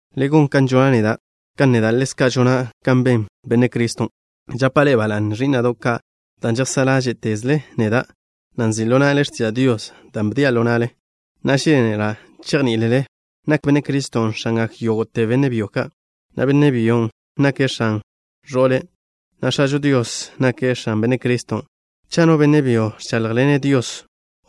Le gon kan žona' neda', kan neda' ḻezka' žona' kan ben Benne' Criston'. Žapa' ḻe'e ba la'ne, ẕí'na'do' ka', dan' žejsá' ḻáže'tezle neda', na' nzi' ḻo na'le x̱tiža' Dios da' bdia' ḻo na'le. Na'a, žénela' chejní'ilele nak Benne' Criston' X̱angak yógo'te benne' byo ka', na' benne' byon' nake' x̱an ẕo'le', na' X̱ažo Dios nake' X̱an Benne' Criston'. Cha' no benne' byo ẕcháḻjḻene' Dios,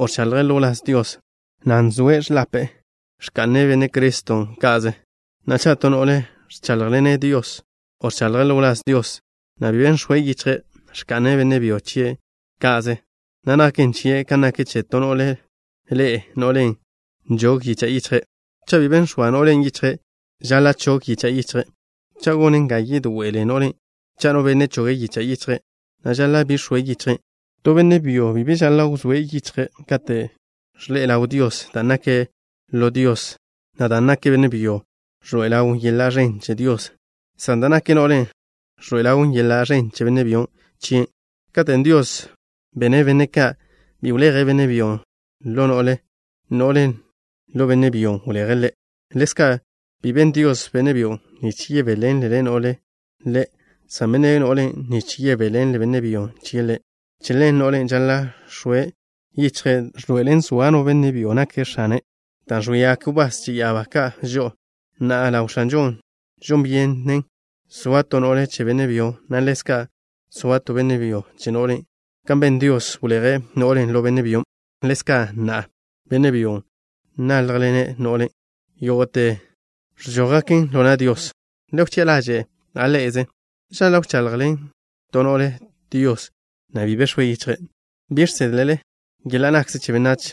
o ẕchaḻje' ḻo wláz Dios, na' nx̱oe' ẕḻape'e, ẕka'ne' Benne' Criston' ka'ze. Na'a, cha' to no'le ẕcháḻjḻene' Dios, o ẕchaḻje' ḻo wláz Dios, na' bi be nx̱oe' yichje', ẕka'ne' benne' byo chie' ka'ze, na' naken chie' kan nak che to no'le ḻe'e, no'len' nžog yicha' yichje'. Cha' bi be nx̱oa no'len' yichje', žaḻa' chog yicha' yichje'. Cha' gon ga yedoe'ele no'len' cha' no benne' choge' yicha' yichje', na' žaḻa' bi x̱oe' yichje'. To benne' byo bi be žaḻa' x̱oe' yichje' kate' ẕḻe'e ḻaw Dios, dan' nake' lo Dios, na' dan' nak benne' byon' ẕḻoe'e ḻawn yeḻa' ẕen che Dios, san da' nak no'len' ẕḻoe'e ḻawn yeḻa' ẕen che benne' byo chien'. Katen' Dios bene' benne' ka', bi wleje' benne' byon' ḻo no'le. No'len', ḻo benne' byon' wleje' ḻe'. Ḻezka', bi ben Dios benne' byon' nich yebéḻenle no'len' ḻe', san bene' no'len' nich yebéḻenle benne' byo chie' ḻe'. Che ḻen, no'len' žaḻa' x̱oe' yichje' da' ẕḻoe'elen zoa no benne' byo nake' x̱ane' dan' ẕwíagak wbás che ya'abá ka' žo'o. Na'a, ḻaw X̱anžon', žon byenen soa to no'le che benne' byo, na' ḻezka' soa to benne' byo che no'le. Kan ben Dios, wleje' no'len' ḻo benne' byon', ḻezka' na'a, benne' byo náljḻene' no'le, na' yógo'te ẕžójgaken ḻo na' Dios. Le wchi'a ḻaže' ḻa' ḻe'eze. ¿Žaḻa' wchaḻjḻen to no'le Dios, na' bi be x̱oe' yichje'? ¿Bi žsedle yeḻa' nakze che benách,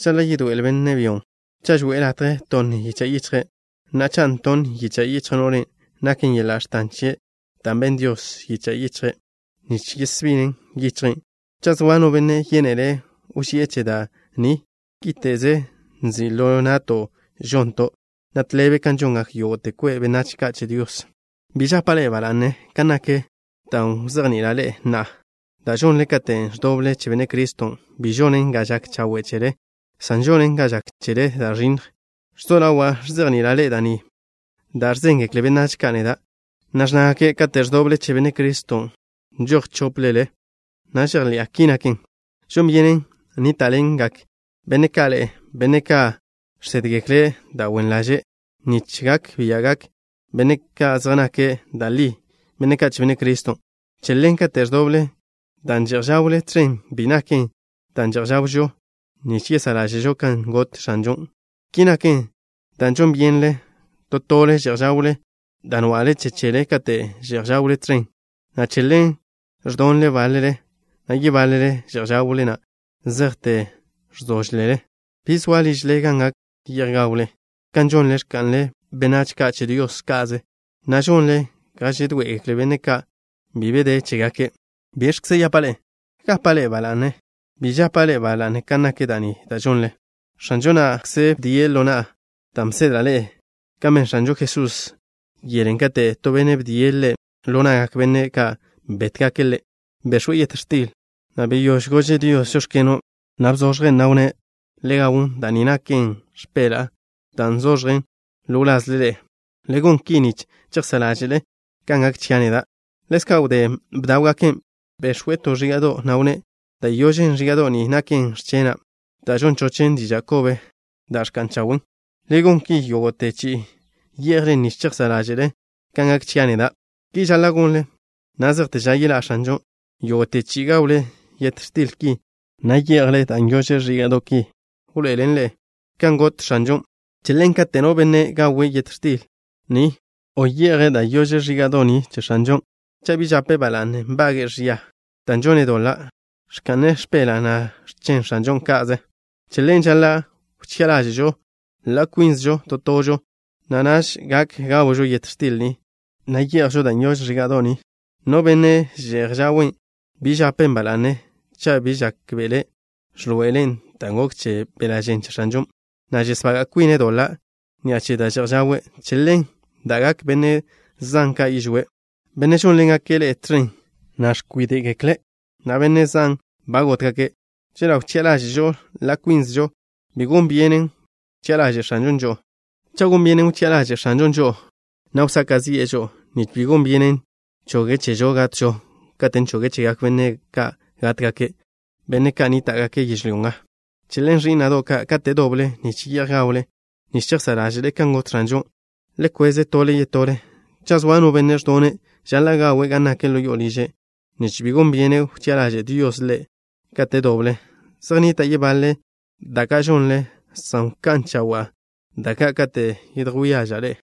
žaḻa' yedoe'ele benne' byon', cha' žoe'e latje tonn yicha' yichje'? Na'a, cha' ntonn yicha' yichj no'len', naken yeḻa' x̱tan chie', dan' benn Dios yicha' yichje' nich yesbinen yichje'. Cha' zoa no benne' yénele' wži'e che da' ni, kíte'ze nzi' ḻo na'to' žonto', na' tḻebe kan žongak yógo'te kwe' benách ka' che Dios. Bi žapa' ḻe'e ba la'ne kan nak da' wzejni'ila' ḻe'e na'a. Da' žonle katen' ẕdoble che Benne' Criston', bi žonen ga žak chawe' chele, san žonen ga žak chele da' ẕinnj. Ẕzo ḻawa' ẕzejni'ila' ḻe'e da' ni da' ẕzéngekle benách ka' neda', na' ẕnnágake' kate' ẕdoble che Benne' Criston', nžoj chóplele, na' žejḻi'a ki naken. Žon byenen nníta'ḻengak benne' ka' ḻe'e, benne' ka' žsédgekle' da' wen ḻaže', nich gak bia'gak benne' ka' zej nake' da' li benne' ka' che Benne' Criston'. Che ḻen, kate' ẕdoble, dan' že'j žawle tẕen bi naken da' že'j žawžo nich yesá' ḻáže'žo kan got X̱anžon'. Ki naken dan' žon byenle to tole že'j žawle da' nwa'le che chele kate' že'j žawle tẕen, na' che ḻen ẕdonle báḻele, na' yebáḻele že'j žawle na' zejte ẕzóžlele. ¿Bi zoa ližle gan gak ye'j gawle? Kan žonle, ẕka'nle benách ka' che Dios ka'ze, na' žonle ga žedoé'egekle benne' ka' bi be de chégake'. ¿Biẕkze yapa' ḻe'e? ¿Gapa' ḻe'e ba la'ne? Bi žapa' ḻe'e ba la'ne kan nak da' ni da' žonle. X̱anžo na'kze bdie' ḻo na'a dan' bsedla' ḻe'e, kan ben X̱anžo Jesusen' yelen' katen' to benne' bdie' Ḻe' ḻo na'gak benne' ka' bétgake' Ḻe'. Bex̱we' yet x̱til, na' wdé gože' Dios: “Žóx̱keno'” na' bzoẕjen', na' wnné': “Le gawn. Da' ni naken x̱peḻa'a da' nzoẕjen ḻo wlazle ḻe'e. Le gon ki nich chejsá' ḻáže'le kan gak chia' neda'.” Ḻezka', wdé bdáwgaken', bex̱we' to ẕíga'do', na' wnné': “Da' yožen ẕíga'do' ni naken x̱chena', da' žon chochen diža' kobe da' ẕka'n chawen'. Le gon ki yógo'te chi'i ye'jlen nich chejsá' ḻáže'le kan gak chia' neda'.” Ki žaḻa' gonle na' zejte ža yeḻá' X̱anžon'. Yógo'te chi'i gawle yet x̱til ki, na' ye'jle che ẕíga'do' ki, wḻoé'elele ḻaw kan got X̱anžon'. Che ḻen, kate' no benne' gawe' yet x̱til ni, o ye'je' che ẕíga'do' ni che X̱anžon', cha' bi žapen' ba la'ne, nbage'e ẕia dan' žone' doḻa', ẕka'ne' x̱peḻa', na' x̱chen X̱anžon' ka'ze. Che ḻen, žaḻa' wchi'a ḻáže'žo ḻa' kwínzežo to tožo, na' naž gak gawžo yet x̱til ni, na' ye'jžo che ẕíga'do' ni. No benne' že'j žawen', bi žapen' ba la'ne cha' bi žákbe'ele' ẕḻoe'elen da' gok che beḻa' žen che X̱anžon', na' žesbaga' kwine' doḻa' ni'a che da' že'j žawe'. Che ḻen da'gak benne' zan ka' yižwé', benne' žónḻengake' ḻe'e tẕen, na' ẕkwíde'gekle', na' benne' zan ba gótgake'. Chela' wchi'a ḻáže'žo ḻa' kwínzežo, bi gon byenen wchi'a ḻaže' X̱anžon' žo'o. Cha' gon byenen wchi'a ḻaže' X̱anžon' žo'o, na' wsaka' zi'e žo'o, nich bi gon byenen choge' chežo gatžo katen' choge' chegak benne' ka' gátgake', benne' ka' nníta'gake' yežlyó nga. Che ḻen, ẕí'na'do' ka', kate' doble nich ye'j gawle nich chejsá' ḻáže'le kan got X̱anžon', le kwez tole yetole. Cha' zoa no benne' ẕdone', žaḻa' gawe' gan nak ḻo yo'o liže', nich bi gon byenen wchi'a ḻaže' Dios ḻe'e kate' doble. Zej nnita' yebaḻe da' ka' žonle, san wká'n chawa'a da' ka' katen' yedjwía' ḻe'e.